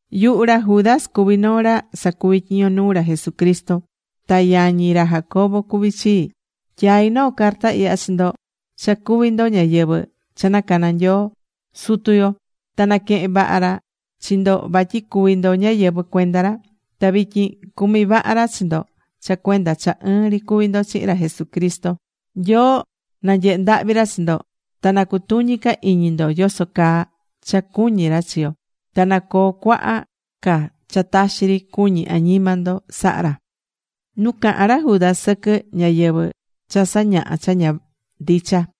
Yuhu ra Judas cuví noo ra sacuví tyiño nuu ra Jesucristo. Ta yañi ra Jacobo cuví chii. Tyaí noo carta ihya chi ndo cha cuví ndo ñáyɨvɨ cha nacana̱ Nyoo Sutu yo. Ta naquehén vaha ra chi ndo vatyi cuví ndo ñáyɨvɨ cuenda ra. Ta vityin cumí vaha ra chi ndo cha cuenda cha ɨɨn ri cuví ndo chihin ra Jesucristo. Nyoo na nyehe ndahvi ra chi ndo. Ta na cutuñi ca iñi ndo yoso caa cha cuñí ra chi yo. Ta na coo cuaha ca cha taxi ri cuñi añima ndo, saha ra.Nu caha̱n ra Judas sɨquɨ ñáyɨvɨ cha sañahá cha ña ndicha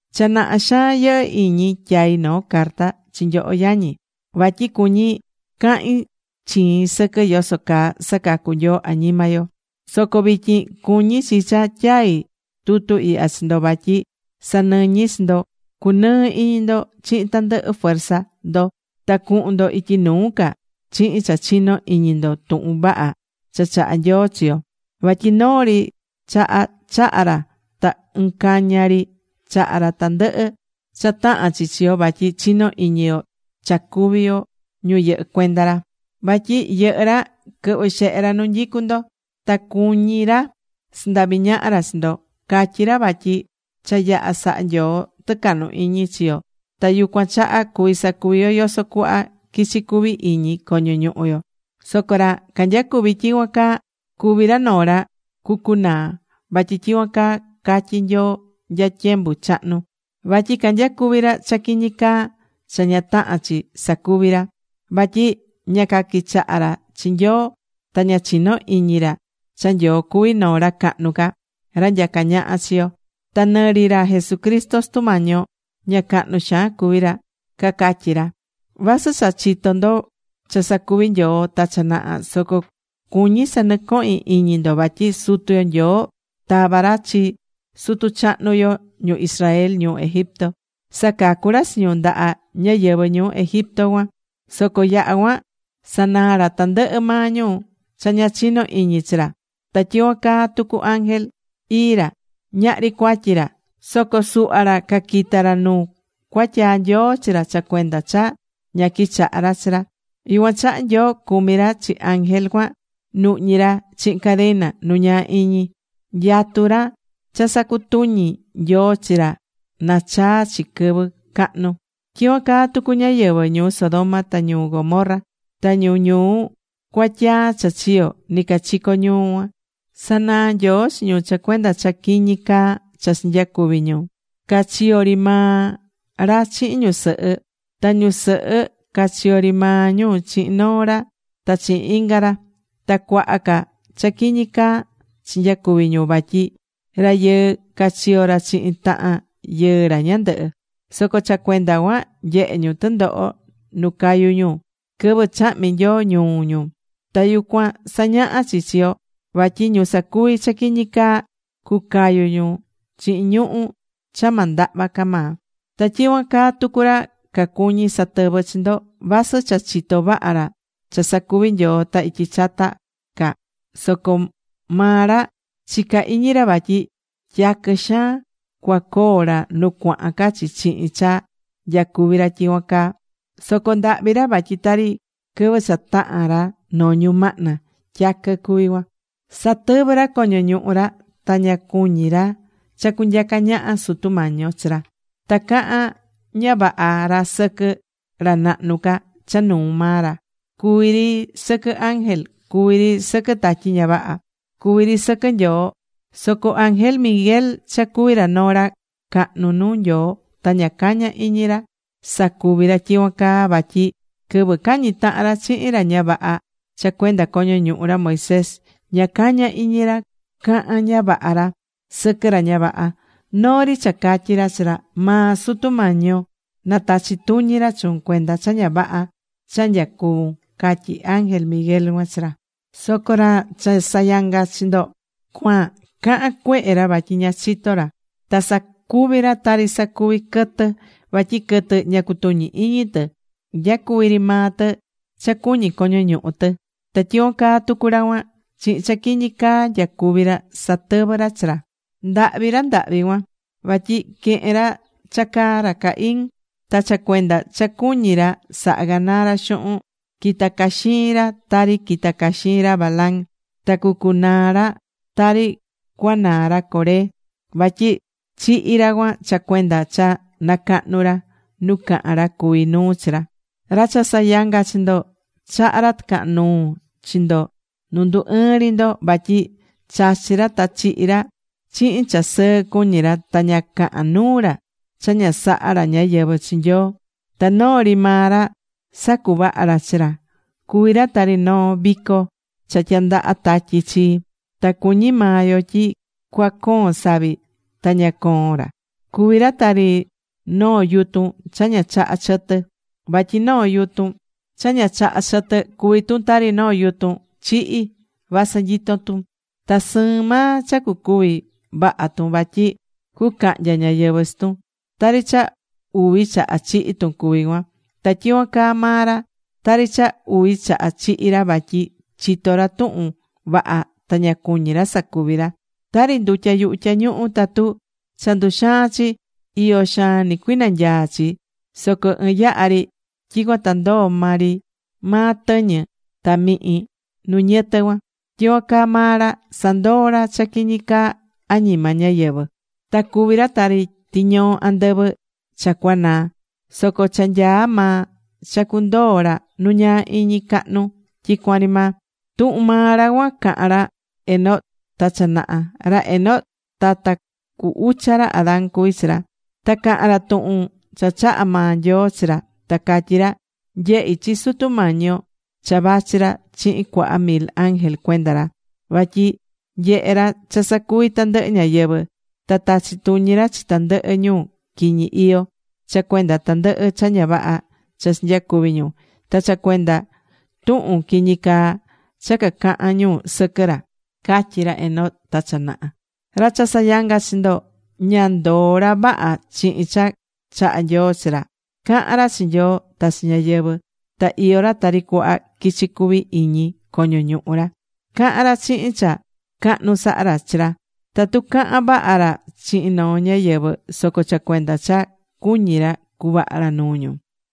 Cha naha xaan yɨhɨ́ iñi tyai noo carta chi nyoho yañi, vatyi cuñí cahin chiin sɨquɨ yoso caa sacacu̱ Nyoo añima yo. Soco vityin cuñí chi cha tyaí tutu ihya chi ndo vatyi sanɨñi chi ndo cunɨɨ iñi ndo chihin tandɨhɨ fuerza ndo ta cuhun ndo ityi nuu ca chihin cha chinó iñi ndo tuhun vaha cha chaha̱ Nyoo chi yo. Vatyi noo ri chaha chaha̱ ra ta ɨɨn caña ri chaha̱ ra tandɨhɨ cha tahán chi chi yo vatyi chinó iñi yo cha cuví yo ñu yɨhɨ́ cuenda ra. Vatyi yɨhɨ́ ra quɨhvɨ́ xehe ra nu nyicu ndo. Ta cuñí ra sandavi ñaha ra chi ndo. Catyí ra vatyi cha yaha̱ saha Nyoo tɨcahnu iñi chi yo ta yucuan chaha cuvi sacuvi yo yoso cuhva quichi cuvi iñi coño ñuhu yo. Soco ra canyacuví tyicuan caa, cuví ra noo ra cucunaa. Vatyi tyicuan caa catyi̱ Nyoo nya tyembu chahnu, vatyi canyacuví ra cha quiñi caa cha ña tahán chi sacuvi ra. Vatyi ña caquichahá ra chi Nyoo ta ña chinó iñi ra cha Nyoo cuví noo ra cahnu ca, ra nyacá ñaha chi yo. Ta nɨ ri ra Jesucristo Sutu Mañi yo, ña cahnu xaan cuví ra, cacatyí ra. Vasɨ cha chitó ndo cha sacuvi̱ Nyoo ta cha naha, soco cuñí sanɨcohín iñi ndo vatyi Sutu yo Nyoo tava̱ ra chi sutu chahnu yo ñu Israel ñuu Egipto, sacacu̱ ra chi ñu ndaha ñáyɨvɨ ñuu Egipto cuan. Soco yaha̱ cuan sanaa̱ ra tandɨhɨ maa ñu cha ña chinó iñi chi ra. Ta tyicuan caa tucu ángel. Ii ra. Ñahri cuatyi ra. Soco suhva ra caquita̱ ra nu cuatyaa̱ Nyoo chi ra cha cuenda cha ña quichahá ra chi ra. Yucuan chaha Nyoo cumí ra chi ángel cuan, nuhñí ra chihin cadena nu ñaa iñi. Nyatú ra cha sacutuñi Nyoo chi ra na chaa chi quɨvɨ cahnu. Tyicuan caa tucu ñáyɨvɨ ñuu Sodoma ta ñuu Gomorra, ta ñu ñuu cuatyaa cha chiyo̱ nicachico ñuu cuan. Sanaa̱ Nyoo chi ñu cha cuenda cha quiñi caa cha chinyacuvi̱ ñu. Ca chiyó ri maa ra chihin ñusɨhɨ. Ta ñusɨhɨ ca chiyó ri maa ñu chihin noo ra ta chihin inga ra. Ta cuaha ca cha quiñi caa chinyacuvi̱ ñu vatyi rayɨɨ ca chiyó ra chihin tahan yɨɨ ra ñandɨhɨ. Soco cha cuenda cuan, nyehe̱ ñu tɨndoho nu cayu̱ ñu, quɨvɨ chahmi̱ Nyoo ñuu ñu. Ta yucuan sañahá chi chi yo vatyi ñu sacuví cha quiñi caa, cucayu ñu chihin ñuhu̱ cha ma ndahva ca maa. Ta tyicuan caa tucu ra cacuñí satɨvɨ chi ndo. Vasɨ cha chitó vaha ra cha sacuvi̱ Nyoo ta ityi chata ca, soco maa ra chicá iñi ra vatyi tyaquɨ xaan cuacoo ra nu cuahan ca chi chihin cha nyacuví ra tyicuan caa. Soco ndahvi ra vatyi tari quɨvɨ cha tahán ra noo ñumahna tyaquɨ cuví cuan. Satɨvɨ́ ra coño ñuhu ra ta ña cuñí ra cha cunyaca ñaha Sutu Mañi yo chi ra. Ta cahán ña vaha ra sɨquɨ ra nahnu ca cha nuu maa ra, cuví ri sɨquɨ ángel, cuví ri sɨquɨ tatyi ña vaha, cuví ri sɨquɨ Nyoo. Soco ángel Miguel cha cuví ra noo ra cahnu nuu Nyoo, ta ña caña̱ iñi ra sacuvi̱ ra tyicuan caa. Vatyi quɨvɨ cañi̱ tahan ra chihin ra ña vaha cha cuenda coño ñuhu ra Moisés, ña caña̱ iñi ra caha̱n ña vaha ra sɨquɨ ra ña vaha. Noo ri cha catyi̱ ra chi ra: “Maa Sutu Mañi yo na tachi tuñi ra chuun cuenda cha ña vaha cha nyacuvún”, catyi̱ ángel Miguel cuan chi ra. Soco ra cha sayangá chi ndo cuan, cahán cuehe ra vatyi ña chitó ra. Ta sacuví ra tari sacuví quɨtɨ. Vatyi quɨtɨ ña cutuñí iñi tɨ. Nyacuví ri maa tɨ cha cuñí coño ñuhu tɨ. Ta tyicuan caa tucu ra cuan. Chihin cha quiñi caa nyacuví ra, satɨvɨ́ ra chi ra. ¡Ndahvi ra ndahvi cuan! Vatyi quehe̱n ra cha caa ra Caín. Ta cha cuenda cha cuñí ra saha ganaa ra xuhun, quitá caxiin ra tari quita̱ caxiin ra Balaam. Ta cucunaa ra tari cuanaa ra Coré, vatyi chihi̱ ra cuan cha cuenda cha nacahnu̱ ra nu cahán ra cuví nuu chi ra. Ra cha sayangá chi ndo chahá ra tɨcahan nuu chi ndo nu ndu ɨɨ́n ri ndo. Vatyi chachí ra ta chihí ra, chihin cha sɨɨ cuñí ra. Ta ña cahán nuu ra cha ña sahá ra ñáyɨvɨ chi Nyoo. Ta noo ri maa ra sacuvahá ra chi ra. Cuví ra tari noo vico cha tyandahá tatyi chi, ta cuñí maa yo tyi cua coon savi, ta ña coón ra. Cuví ra tari noo yutun cha ña chaha chɨtɨ. Vatyi noo yutun cha ña chahá chɨtɨ cuví tun tari noo yutun chihi̱ vasɨ nyitó tun. Ta sɨɨn maa cha cucúvi vaha tun vatyi cucahnya ñáyɨvɨ chi tun. Tari cha uvi chaha chihi̱ tun cuví cuan. Ta tyicuan caa maa ra, tari cha uvi chaha chihi̱ ra vatyi chitó ra tuhun vaha ta ña cuñí ra sacuvi. Tari ndutya yuhu tyañuhu tatu cha nduxaan chi, iyo xaan nɨcuinanyaa chi. Soco ɨɨn yaha ri tyicuan ta ndoo maa ri maa tɨñɨ ta mihin nu niyɨtɨ cuan. Tyicuan caa maa ra, sandoó ra cha quiñi caa añima ñáyɨvɨ. Ta cuví ra tari tiñoo andɨvɨ cha cuanaa̱. Soco cha nyaá maa cha cundoo ra nu ñaa iñi cahnu tyicuan ri maa. Tuhun maa ra cuan caha̱n ra Enoc ta cha naha. Ra Enoc tata cu ucha ra Adán cuvi̱ ra. Ta caha̱n ra tuhun cha chaha̱ maa Nyoo chi ra, ta catyí ra: “Nyehi̱ chi Sutu Mañi yo cha vachí ra chihin cuaha mil ángel cuenda ra vatyi nyehe ra cha sacuvi tandɨhɨ ñáyɨvɨ. Ta tachí tuñi ra chi tandɨhɨ ñu quiñi iyó cha cuenda tandɨhɨ cha ña vaha cha chinyacuvi̱ ñu, ta cha cuenda tuhun quiñi caa cha cacahán ñu sɨquɨ ra”, catyi̱ ra Enoc ta cha naha. Ra cha sayangá chi ndo, ña ndoó ra vaha chihin cha chahá Nyoo chi ra. Cahán ra chi Nyoo ta chi ñáyɨvɨ ta iyó ra tari cuhva quichi cuví iñi coño ñuhu ra. Cahán ra chihin cha cahnu sahá ra chi ra. Tatu cahan vaha ra chihin noo ñáyɨvɨ soco cha cuenda cha cuñí ra cuvaha ra nuu ñu.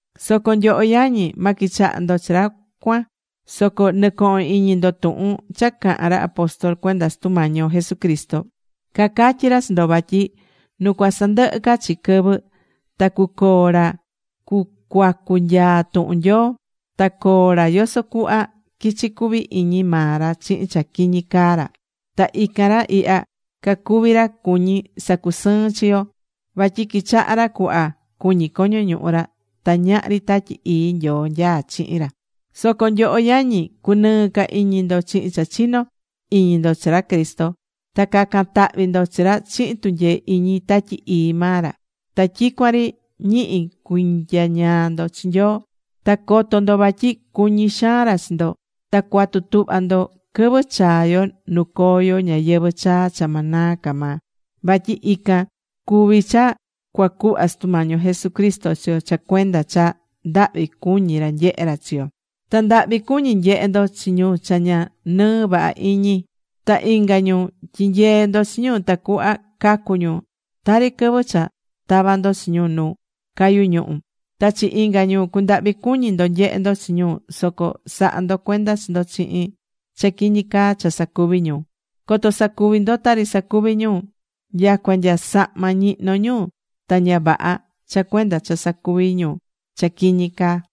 Soco nyoho yañi, ma quichaha ndo chi ra cuan. Soco nɨ̱cohon iñi ndo tuhun cha caha̱n ra apóstol cuenda Sutu Mañi yo Jesucristo. Cacatyi̱ ra chi ndo vatyi nu cuasandɨhɨ ca chi quɨvɨ ta cuacoo ra cucuacu nyaa tuhun Nyoo. Ta coo ra yoso cuhva quichi cuvi iñi maa ra chihin cha quiñi caa ra. Ta ican ra ihya cacuví ra cuñí sacusɨɨn chi yo. Vatyi quichahá ra cuhva cuñí coño ñuhu ra ta ñahri Tatyi Ii Nyoo nyaá chihin ra. Soco nyoho yañi, cu̱nɨɨ ca iñi ndo chihin cha chinó iñi ndo chi ra Cristo. Ta ca̱can tahvi ndo chi ra chihin tunyee iñi Tatyi Ii maa ra. Ta tyicuan ri ñihi cui̱nyañaa ndo chi Nyoo, ta co̱to ndo vatyi cuñí xaan ra chi ndo. Ta cua̱tu tuhva ndo quɨvɨ chaa yo nu coo yo ñayɨvɨ̱ chaa cha ma naa ca maa. Vatyi ican cuví cha cuacuhva Sutu Mañi yo Jesucristo chi yo cha cuenda cha ndahvi cuñí ra nyehé ra chi yo. Ta ndahvi cu̱ñi nyehe ndo chi ñu cha ña nɨɨ vaha iñi. Ta inga ñu, tyi̱nyee ndo chi ñu tacuhva cacu ñu. Tari quɨvɨ cha tava ndo chi ñu nu cayú ñuhu̱. Ta chi inga ñu cu̱ndahvi cuñi ndo nyehe ndo chi ñu, soco sa̱ha ndo cuenda chi ndo chihin cha quiñi caa cha sacuví ñu, coto sacuvi ndo tari sacuví ñu. Nyacua nya sahma ñihnó ñu ta ña vaha cha cuenda cha sacuví ñu cha quiñi caa.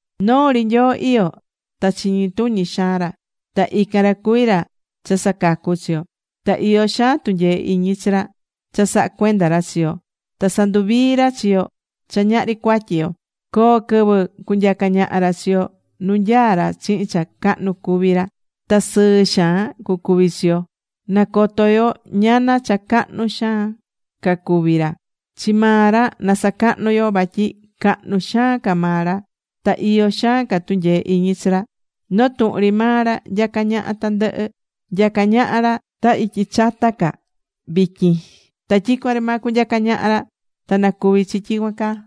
Noo ri Nyoo iyó, ta chiñi tuñi xaan ra. Ta ican ra cuví ra cha sacacú chi yo. Ta iyó xaan tunyee iñi chi ra cha sahá cuenda ra chi yo ta sanduvií ra chi yo cha ñahri cuatyi yo coo quɨvɨ cunyaca ra chi yo nu nyaá ra chihin cha cahnu cuví ra. Ta sɨɨ xaan cucuvi chi yo. Na coto yo ñana cha cahnu xaan ca cuví ra. Chi maa ra na sacahnu yo vatyi cahnu xaan ca maa ra. Ta iyó xaan ca tunyee iñi chi ra. Noo tuhun ri maa ra nyacá ñaha tandɨhɨ. Nyacá ñaha ra ta ityi chata ca, vityin. Ta tyicuan ri maa cunyaca ñaha ra. Ta na cuvi chi tyicuan caa.